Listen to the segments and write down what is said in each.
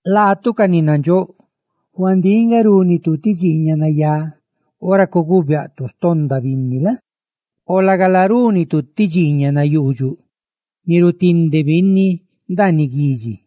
Laatu, ca ni nandxóꞌ, huandíꞌ nga rúnitu ti dxiiñaꞌ nayá ora cuguubiaꞌtu xtonda binni la? O lagala, rúnitu ti dxiiñaꞌ nayuudxuꞌ; rutindesitu binni ndaaniꞌ guidxi.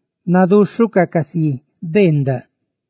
Naduxhucaꞌ casi beendaꞌ;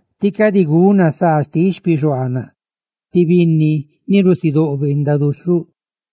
tí cadi guna saa xtiꞌ xpixuaanaꞌ, ti binni ni rusidóꞌ beendaꞌ duxhuꞌ.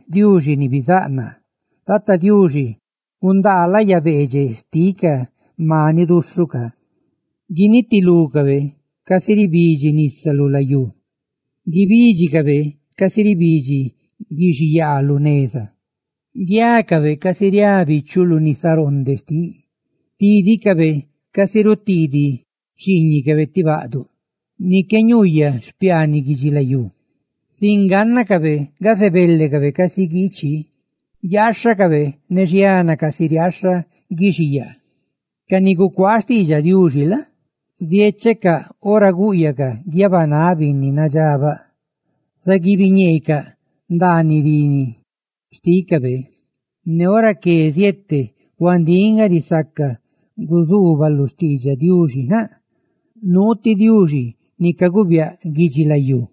Diuxi ni bizáꞌ naa, ¡gundaa láyacabe! Tata Diuxi, ¡gundaa laya beedxeꞌ xtiꞌ ca maniꞌ duxhuꞌ ca! Guinitilúcabe, casi ribidxi nisa lu layú; guibídxicabe, casi ribidxi guixiyaa lu neza; guiácabe, casi riá bichuꞌ lu nisaroonde xtiꞌ, ¡tídicabe casi rutiidiꞌ xiiñicabe ti baꞌduꞌ ni qué ñuuyaꞌ xpiaaniꞌ guidxilayú!, sin gánnacabe gazebelecabe casi guichi; guiaaxhacabe ne xiana, casi riaaxha guixiyaa. Ca ni gucuaa xtiidxaꞌ Diuxi la? ziéchecaꞌ ora gúꞌyacaꞌ guiabanáꞌ binni nadxabaꞌ; ¡zugadxecaꞌ ñeecaꞌ ndaaniꞌ rini xtícabe! Ne ora que zuzeeteꞌ binni: «¡Huandíꞌ nga risaca guzuubaluꞌ xtiidxaꞌ Diuxi! ¡Nuu ti Diuxi ni caguubiaꞌ guidxilayú!»